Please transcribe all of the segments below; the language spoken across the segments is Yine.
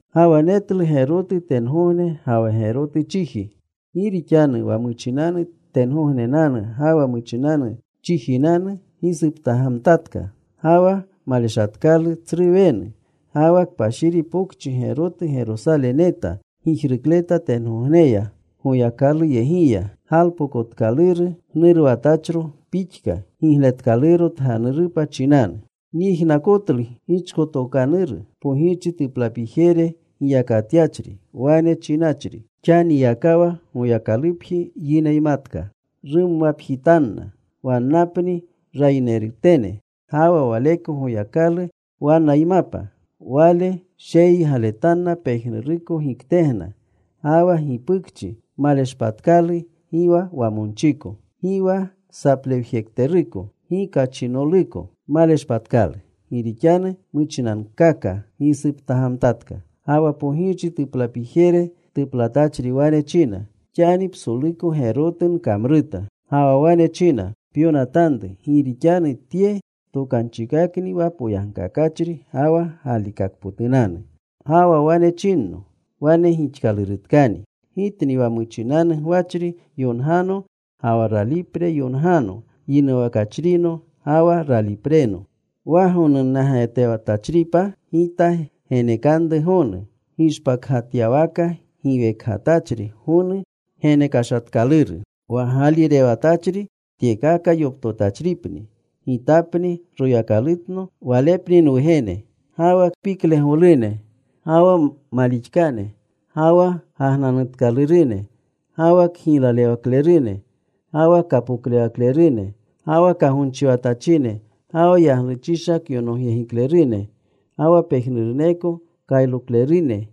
Ga wa netlu gerotu tengogne ga wa gerotu chiji. Gi rixanu wa muchinanu tengognenanu ga wa muchinanu chijinanu gisuptagamtatka. Ga wa maleshatkalu tsru wenu. Ga wa kpashiri pokchi gerotu Gerosale neta gijrukleta tengogneya Goyakaluyegiya, galpokotkaluru gnuruwatachro pixka gigletkaluro tganurupa chinanu. Nyijnakotlu gichkotokanuru pogirchi tuplapijere giyakatyachri, wane chinachri, “Xaniyakawa Goyakalupji yineymatka. Rumwapjitanna. Wannapni rayinerutene. Ga wa Waleko Goyakalu wannaymapa. Wale sheyiygaletanna pejnuruko giktegna. Ga wa gipukchi maleshpatkalu, gi wa wamonchiko, gi wa saplewjekteruko, gi kachinoluko. Maleshpatkalu. Gi rixanu muchinankaka gisuptagamtatka.” Ga wa pogirchi tuplapijere tuplatachri wane china, “Xani psoluko gerotu nkamruta.” Ga wa wane china, “Pyonatanru. Gi rixanu tye tokanchikakni wa poyagkakachri ga wa galikakpotunanu.” Ga wa wane chinno, “Wane gixkalurutkani. Gitni wa muchinanu gwachri yongano ga wa ralipre yongano, wa yinuwakachrino ga wa ralipreno. Wa gonunnagatewatachripa Gita genekanru gonu gishpakgatyawaka giwekgatachri gonu genekashatkaluru. Wa gaalirewatachri tyekaka yoptotachripni. Gitapni Royakalutno. Walepni nwugene. Ga wa kpiklegolune, ga wa malixkane, ga wa gagnanutkalurune, ga wa kgiylalewaklerune, ga wa kapoklewaklerune, ga wa kagonchiwatachine, ga wa yagluchisha kyonogyegiklerune, ga wa pejnuruneko kayroklerune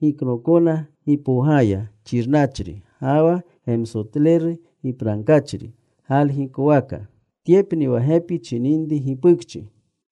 giknookona gipowgaya, xirnachri ga wa gemsotleru gipragkachri galgikwaka. Tyepni wa gepi chininri gipukchi.”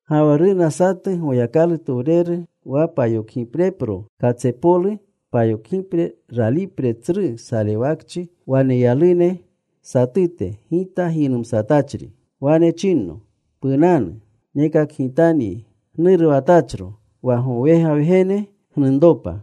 Ga wa runa satu Goyakalutowreru, wa payokgiprepro katsepolu payokgipre ralipre tsru salewakchi waneyalune satute, gita giynumsatachri. Wane chinno, “Punanu. Nekakgitanyi gnuruwatachro, wa gowega Wgene gnunropa.”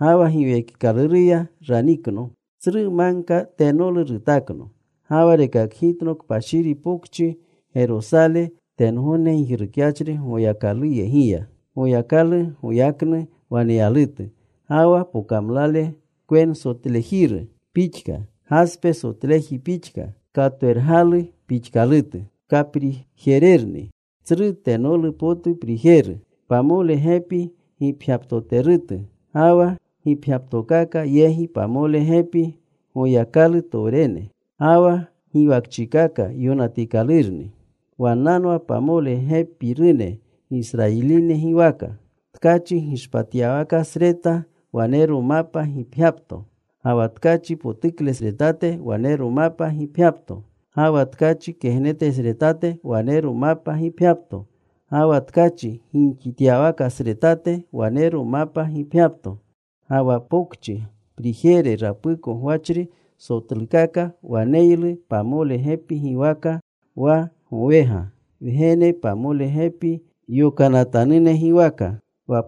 Ga wa Giwekikaluruya ranikno. Tsru magka tenolu rutakno. Ga wa rekakgitno kpashiri pokchi Gerosale, tengogne gijrukyachri Goyakaluyegiya. Goyakalu goyaknu waneyalutu. Ga wa pokamlale kwensotlejiru pixka, gaspe sotleji pixka, katwergalu pixkalutu. Kaprijererni, tsru tenolu potu prijeru. Pamole gepi gipgyaptoterutu. Ga wa gipgyaptokaka yegi pamole gepi Goyakalutowrene. Ga wa giwakchikaka yonatikalurni. Wannanwa pamole gepinerune Gisrayiline giwaka. Tkachi gishpatyawakasreta wanero mapa gipgyapto. Ga wa tkachi potuklesretate wanero mapa gipgyapto. Ga wa tkachi kegnetesretate wanero mapa gipgyapto. Ga wa tkachi gimxityawakasretate wanero mapa gipgyapto. Ga wa pokchi prijere rapuko gwachri sotlukaka waneylu pamole gepi giwaka, wa gowega Wgene pamole gepi yokanatanune giwaka.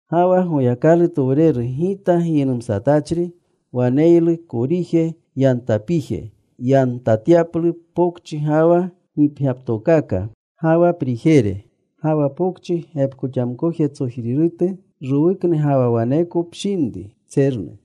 Ga wa Goyakalutowreru gita giynumsatachri waneylu korije yantapije, yantatyaplu pokchi ga wa gipgyaptokaka ga wa prijere. Ga wa pokchi gepkoxamkojetsojrirutu. Rowuknu ga wa waneko pshinru tsernu.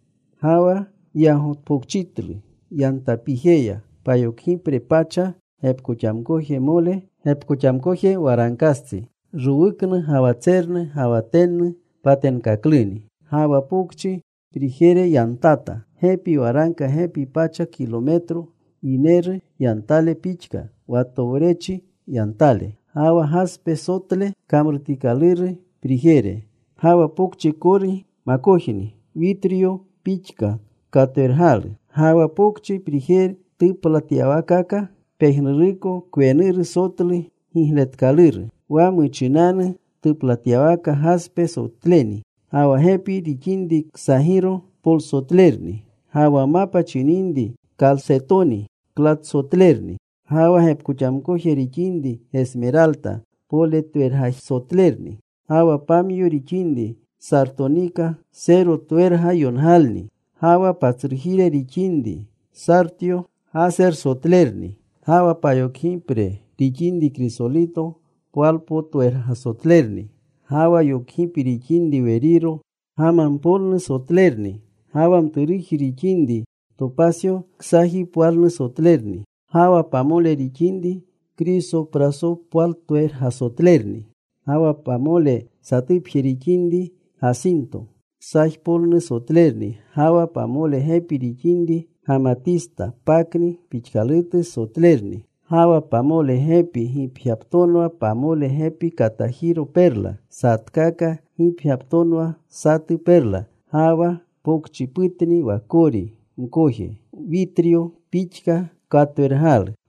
Ga wa yagotpokchitlu yantapijeya, payokgipre pacha gepkoxamkojmole gepkoxamkoje waragkastsi. Rowuknu ga wa tsernu ga wa tennu patenkakluni. Ga wa pokchi prijere yantata. Gepi waragka gepi pacha kilometro, yineru yantale pixka, wa towrechri yantale. Ga wa gaspe sotle kamrutikaluru prijere. Ga wa pokchi kori makojni witryo pixka katwergalu. Ga wa pokchi prijere tuplatyawaakaka pejnuruko kwenuru sotlu gigletikaluru. Wa muchinanu tuplatyawaka gaspe sotleni. Ga wa gepi rixinri ksagiro polsotlerni. Ga wa mapa chininri kalsetoni klatsotlerni. Ga wa gepkoxamkoje rixinri gesmeralta poletwergasotlerni. Ga wa pamyo rixinri sartonika serotwergayongalni. Ga wa patsrujire rixinri sartyo gasersotlerni. Ga wa payokgipre rixinri krisolito pwalpootwergasotlerni. Ga wa yokgipi rixinri weriro gamampolnursotlerni. Ga wa mturuji rixinri topasyo ksajipwalnursotlerni. Ga wa pamole rixinri krisoprasopwaltwergasotlerni. Ga wa pamole satupje rixinri gasinto ksajpolnursotlerni. Ga wa pamole gepi rixinri gamatista pakni pixkalutu sotlerni. Ga wa pamole gepi gipgyaptonwa pamole gepi katajiro perla. Satkaka gipgyaptonwa satu perla. Ga wa pokchiputni wa kori mkoje, witryo pixka katwergalu.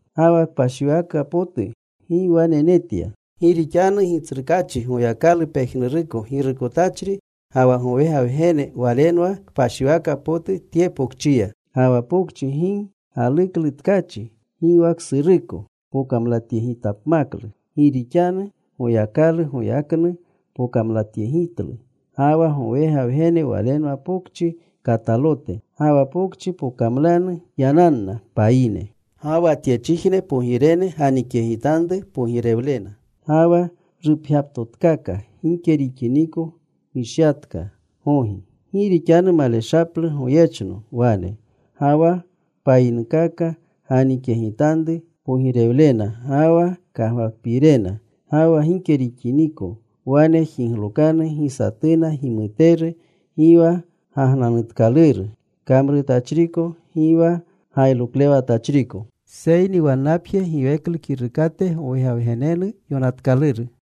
Ga wa kpashiwaka potu gi wane netya. Gi rixanu Gitsrukaachi Goyakalu pejnuruko Girukotachri ga wa gowega Wgene Walenwa kpashiwaka potu tye pokchiya. Ga wa pokchi gi galuklu tkachi gi wa ksuruko pokamlatyegityapmaklu. Gi rixanu Goyakalu goyaknu pokamlatyegitlu. Ga wa gowega Wgene Walenwa pokchi katalote. Ga wa pokchi pokamlanu yananna payine. Ga wa tyechijne pogirene ganikyegitanru pogirewlena. Ga wa rupgyaptotkaka gike rixiniko gishyatka gogi. Gi rixanu maleshaplu goyechno wane. Ga wa payinkaka ganikyegitanru pogirewlena ga wa kagwakpiirena. Ga wa gike rixiniko wane jiglokanu gi satuna gimuteru, gi wa gagnanutkaluru kamrutachriko, gi wa gayroklewatachriko, seyni wannapje giweklu kirukate gowega Wgenenu yonatkaluru.